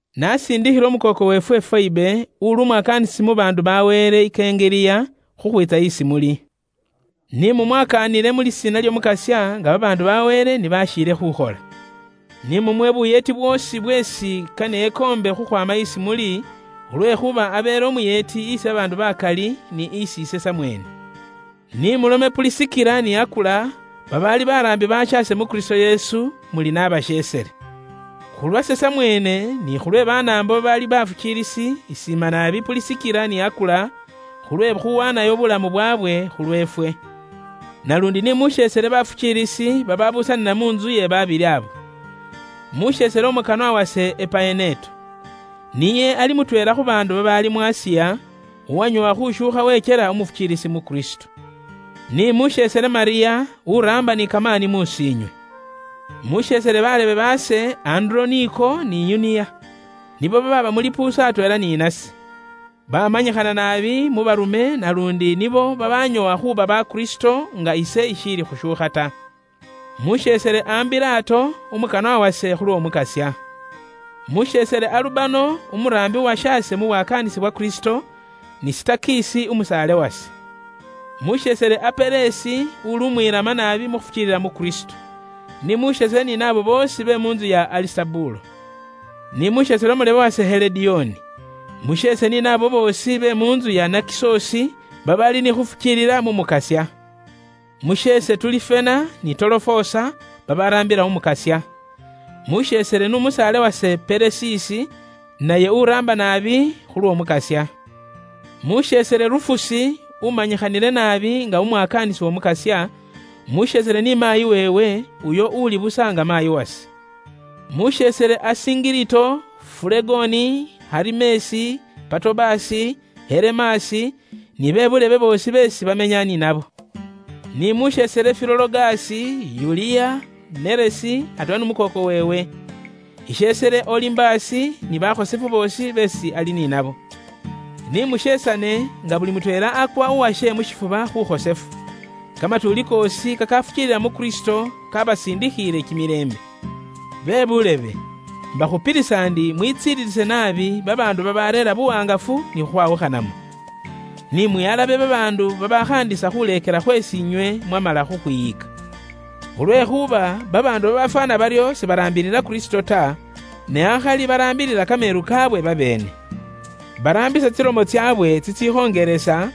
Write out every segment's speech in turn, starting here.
Naasiindikhile umukooko weefwe Foebe, uuli umwakaanisi mu baandu ba Wele, i Kengeliya, khukhwiitsa isi muli. Ni mumwakaanile mu lisiina ly'Omukasya, nga bakhosefu ba Wele ni bashiile khuukhola. Ni mumuwe buyeeti bwoosi bweesi kane ekoombe khukhwaama isi muli, khulwekhuuba abeele umuyeeti isi babaandu bakali, ni isi ise samweene. Ni mulome Pulisikila ni Akula, babaali baraambi bashaase mu Kristo Yesu, muli naabasheesele. Khulwase samweene ni khulwe Banaambo babaali bafukiilisi, isiima naabi Pulisikila ni Akula, khulwe khuwaanayo buulamu bwaabwe, khulweefwe. Naluundi ni musheesele bafukiilisi babaabuusanila mu ntsu iye babili abo. Musheesele umukanwa wase Epaeneto. Niye ali mutweela khu baandu babaali mu Asiya, uwanyoowa khushuukha wekyela umufukiilisi mu Kristo. Ni musheesele Malyamu, uraamba ni kamaani mus'iinywe. Musheesele balebe baase Anduroniko ni Yuniya. Nibo babaaba mu lipuusu atweela ni nase. Baamanyikhana naabi mu baarume naluundi nibo babanyoowa khuuba bakristo nga ise ishiili khushuukha ta. Musheesele Ambilato, umukanwa wase khulw'Omukasya. Musheesele Alubano, umuraambi uwashaase mu bwakaanisi bwa Kristo, n'umukanwa wase Sitakisi. Musheesele Apelesi, uli umwilama naabi mu khufukiilila mu Kristo. Ni musheesele ni naabo boosi be mu ntsu iya Alisitobulo. Ni musheesele umulebe wase, Helodioni. Musheese ni naabo boosi be mu ntsu iya Nakisosi babaali ni khufukiilila mu Mukasya. Musheese Tulifena ni Tolofosa, babaraambila Umukasya. Musheesele n'umukanwa wase Pelesisi, naye uraamba naabi khulw'Omukasya. Musheesele Rufusi, umanyikhanile naabi nga umwakaanisi w'Omukasya, musheesele ni maayi weewe, uyo uuli busa nga maayi wase. Musheesele Asingilito, Fulegoni, Herimesi, Patobasi, Heremasi, ni be buulebe boosi beesi bamenya ni nabo. Ni musheesele Filologasi, Yuliya, Neresi atweela n'umukooko weewe. Isheesele Olimbasi ni bakhosefu boosi beesi ali ni nabo. Ni musheesane nga buli mutweela akwa uwashe mu shifuba khukhosefu. Kamatuuli koosi kakafukiilila mu Kristo kabasindikhiile kimilembe. Bebuulebe, imbakhupilisa ndi mwitsililise naabi babaandu babareera buwaangafu ni khukhwawukhanamo. Ni mwihalabe babaandu babaakhaandisa khuleekela khweesi inywe mwamala khukhwiyika. Khulwekhuuba babaandu babafwaana baryo sibaraambilila Kristo ta, ne akhali baraambilila kameelu kaabwe babeene. Baraambisa tsilomo tsaabwe tsitsikhongelesa,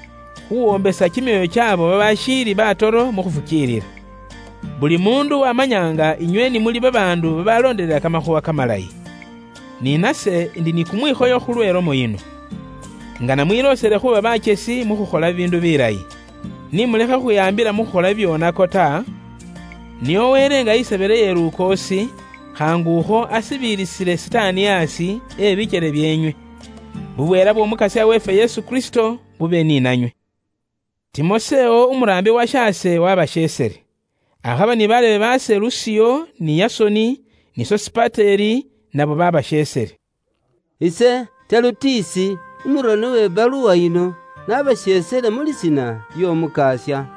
khuwombesa kimyoyo kyaabo babaashiili batoro mu khufukiilila. Buli muundu wamanya nga inywe ni muli babaandu babaloondelela kamakhuuwa kamalayi. Ni nase indi ni kumwikhoyo khulwe lomo yino. Ingana mwiloosele khuuba bakyesi mu khukhola bibiindu bilayi. Ni mulekhe khukhwihaambila mu khukhola bibyoonako ta, nio Wele nga niye isebele iye lukoosi, khaangu akho, asibiilisile Sitaani aasi, e bikele byeenywe. Bubweela bw'Omukasya weefwe Yesu Kristo bube ni nanywe. Timosewo umuraambi washaase wabasheesele. Akhaba ni balebe baase Lusiyo, ni Yasoni, ni Sosipateli, nabo babasheesele. Ise Telutisi, umuroni uwe baluwa yino, nabasheesele mu lisiina ly'Omukasya.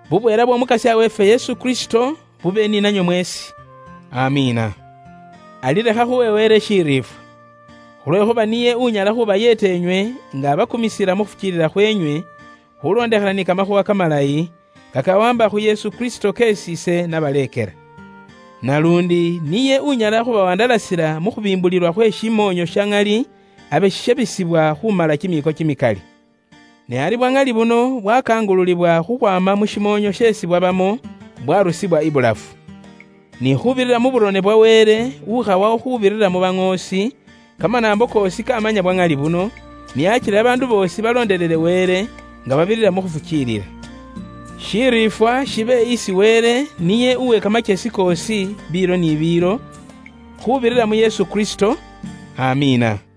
Bubweela bw'Omukasya weefwe Yesu Kristo bube ni nanywe mweesi. Amiina. Ari lekha khuwe Wele shiriifwa. Khulwekhuuba niye unyala khubayeeta inywe nga abakumisila mu khufukiilila khwenywe, khulondekhana ni kamakhuuwa kamalayi, kakawaamba khu Yesu Kristo keesi ise nabaleekela. Naluundi niye unyala khubawandalasila mu khubiimbulilwa khwe shimoonyo sha ŋali abe shishabisibwa khumala kimiiko kimikali. Ne ari bwa ŋali buno bwakangululibwa khukhwaama mu shimoonyo sheesi bwabamo, bwarusibwa ibulafu. Ni khuubirira mu byaronebwa bikhosefu bye ba baŋoosi, kamanaambo koosi kamanya bwa ŋali buno, nio akile babaandu boosi baloondelele Wele uwe biilo ni biilo, nga babirira mu khufukiilila. Shiriifwa shibe isi Wele niye uwe kamakyesi koosi biilo ni biilo, khuubirira mu Yesu Kristo. Amiina.